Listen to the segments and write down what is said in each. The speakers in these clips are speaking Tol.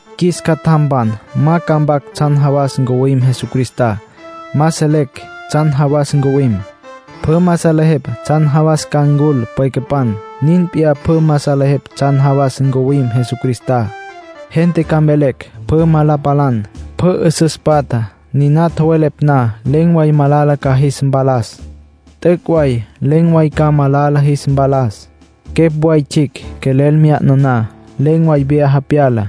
Qjuis catjampan, ma ca mpac tsjan jawas ncuwim Jesucristá. Ma selecj tsjan jawas ncuwim. Pjü ma salejepj tsjan jawas ca ncul pwecapan. Nin p'iyá pjü ma salejepj tsjan jawas ncuwim Jesucristá. Gente ca mvelecj pjü ma la palan, pjü 'üsüs patja. Niná tjowelepj na, len̈ way malala ca jis mpalas. T'üc' way len̈ way ca malala jis mpalas. Quepj way tsjicj quelel mya'na na, len̈ way vyaja pyala.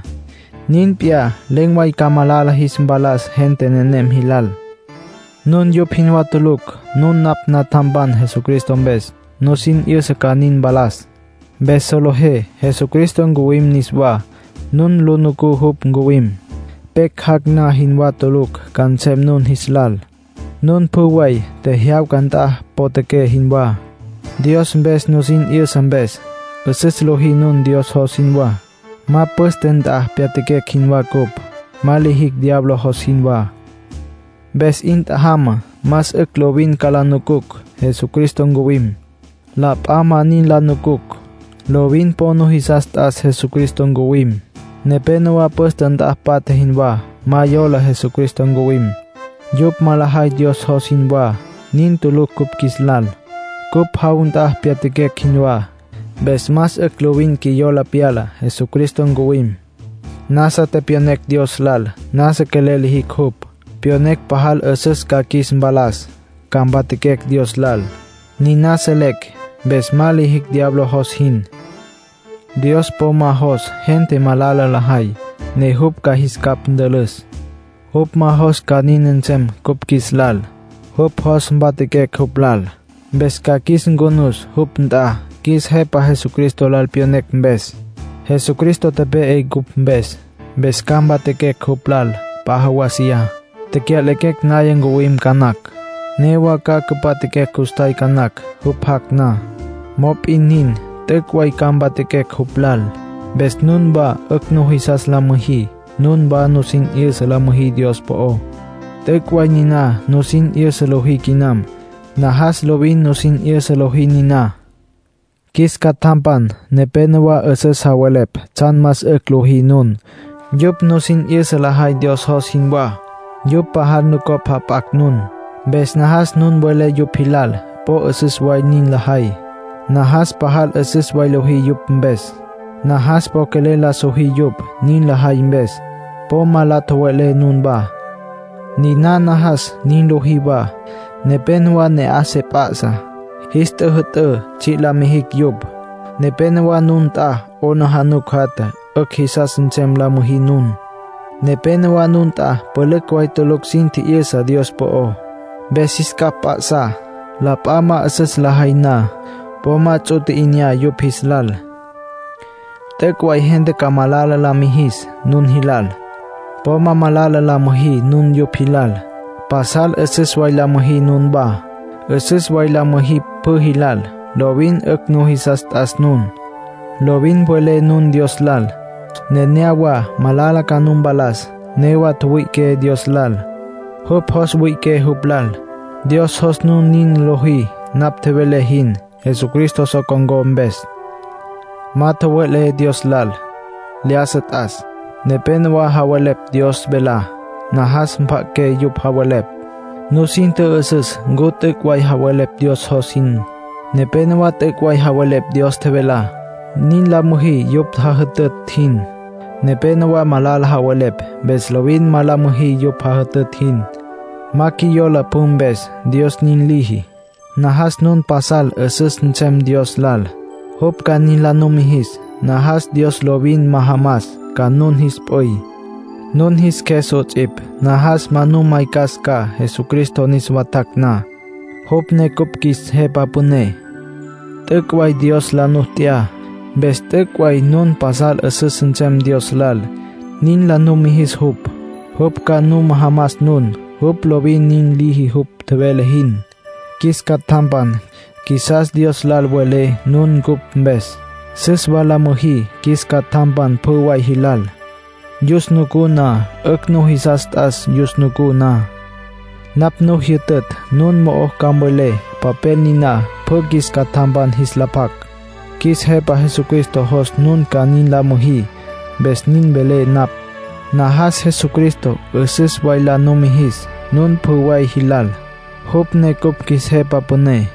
Nin p'iyá, len̈ way ca malala jis mpalas gente nenem jilal. Nun yupj jinwá tulucj. Nun napj natjampan Jesucristo mpes. Nusin 'yüsa ca nin mpalas. Mpes solejé Jesucristo ncuwim niswá. Nun lu nucú jupj ncuwim. Pecj jac' na jinwá tulucj ca nsem nun jis lal. Nun pjü way, tjejyawca nt'a potjaqué jinwá, Dios mpes nusin 'yüsa mpes. 'Üsüs lojí nun, Dios jos jinwá. Ma püste nt'a pyatjaquecj jinwá cupj. Ma lijicj diablo jos jinwá. Mpes 'in tjajamá, más 'ücj lovin ca la nucucj Jesucristo ncuwim. La p'a ma nin la nucucj. Lovin po nujisas t'as Jesucristo ncuwim. Nepénowa püste nt'a patja jinwá; ma yola Jesucristo ncuwim. Yupj ma lajay Dios jos jinwá. Nin tulucj cupj qjuis lal. Cupj jaw nt'a pyatjaquecj jinwá. Mpes más 'ücj lovin qjuiyola pyala Jesucristo ncuwim. Nasa tepyonecj Dios lal. Nasa quelel lijicj jupj. Pyonecj pajal 'üsüs ca qjuis mpalas, ca mpatjaquecj Dios lal. Niná selecj, mpes ma lijicj diablo jos jin. Dios po ma jos gente malala lajay, ne jupj ca jis capj ntülüs. Jupj ma jos ca nin nsem cupj qjuis lal. Jupj jos mpatjaquecj jupj lal. Mpes ca qjuis ncunus jupj nt'a qjuis Jepa Jesucristo lal tepyonecj mpes. Jesucristo tepe'e cupj mpes. Mpes ca mpatjaquecj jupj lal p'a jawasiyá. Tecya'lequecj naya ncuwim ca nacj. Newa ca cüpatjaquecj custjay ca nacj, jupj jac' na. Mop'in nin, t'üc' way ca mpatjaquecj jupj lal. Mpes nunwá 'ücj nujisas la müjí. Nunwá nusin 'yüsa la müjí Dios po'ó. T'üc' way niná nusin 'yüsa lojí quinam. Najas lovin nusin 'yüsa lojí niná. Qjuis catjampan, nepénowa 'üsüs javelepj tsjan más 'ücj lojí nun. Yupj nusin 'yüsa lajay Dios jos jinwá. Yupj pajal nucopj jap'acj nun. Mpes najas nun welé yupj jilal po 'üsüs way nin lajay. Najas pajal 'üsüs way lojí yupj mpes. Najas po quelel la sojí yupj, nin lajay mpes. Po ma la tjowe'lé nunwá. Niná najas nin lojí wa: nepénowa ne'aj se pjasá. Jis tjüjü'tǘ tsji' la mijicj yupj. Nepénowa nun nt'a 'aplijila jatja. 'Ücj jisas nsem la müjí nun. Nepénowa nun nt'a pülücj way tulucj sin tji'yüsa Dios po'ó. Mpes jis capj mp'a'sá. La p'a ma 'üsüs lajay na, po ma ts'u tji'inyá yupj jis lal. T'üc' way gente ca malala la mijis nun jilal. Po ma malala la müjí nun yupj jilal. Pasal 'üsüs way la müjí nunwá. 'Üsüs way la müjí pjü jilal. Lovin 'ücj nujisas t'as nun. Lovin mvelé nun Dios lal. Nenéyawa malala ca nu mpalas. Newa tjüwüi'iqué Dios lal. Jupj jos wüi'iqué jupj lal. Dios jos nun nin lojí napj tjevelé jin, Jesucristo so con̈có mpes. Ma tjowelé Dios Cjües lal: “Lyájasa t'as”. Nepénowa javelepj Dios velá. Najas mpja'aqué yupj javelepj. Nusin tjü'üsüs ncu t'üc' way javelepj Dios jos jin. Nepénowa t'üc' way javelepj Dios tjevelá. Nin la müjí yupj jajütütj jin. Nepénowa malala javelepj. Mpes lovin ma la müjí yupj jajütütj jin. Ma qjuiyola pjü mpes, Dios nin liji. Najas nun pasal 'üsüs nsem Dios lal, jupj ca nin la numijis. Najas Dios lovin majamas ca nun jis p'üy, nun jis qjues 'ots'ipj. Najas ma nu maycas ca Jesucristo niswa tjac' na, jupj ne cupj qjuis Jepa Püné. T'üc' way Dios la nu t'ya. Mpes t'üc' way nun pasal 'üsüs nsem Dios lal, nin la numijis jupj. Jupj ca nu majamas nun. Jupj lovin nin liji jupj tjevele jin. Qjuis catjampan, qjuisas Dios lal mvelé nun cupj mpes. Süs wa la müjí qjuis catjampan pjü way jilal, yus nucú na. 'Ücj nujisas t'as yus nucú na. Napj nu jyütütj nun mo'o ca mvelé papel niná pjü qjuis catjampan jis la pjac. Qjuis Jepa Jesucristo jos nun ca nin la müjí, mpes nin velé napj. Najas Jesucristo 'üsüs way la numijis nun pjü way jilal, jupj ne cupj qjuis Jepa Püné.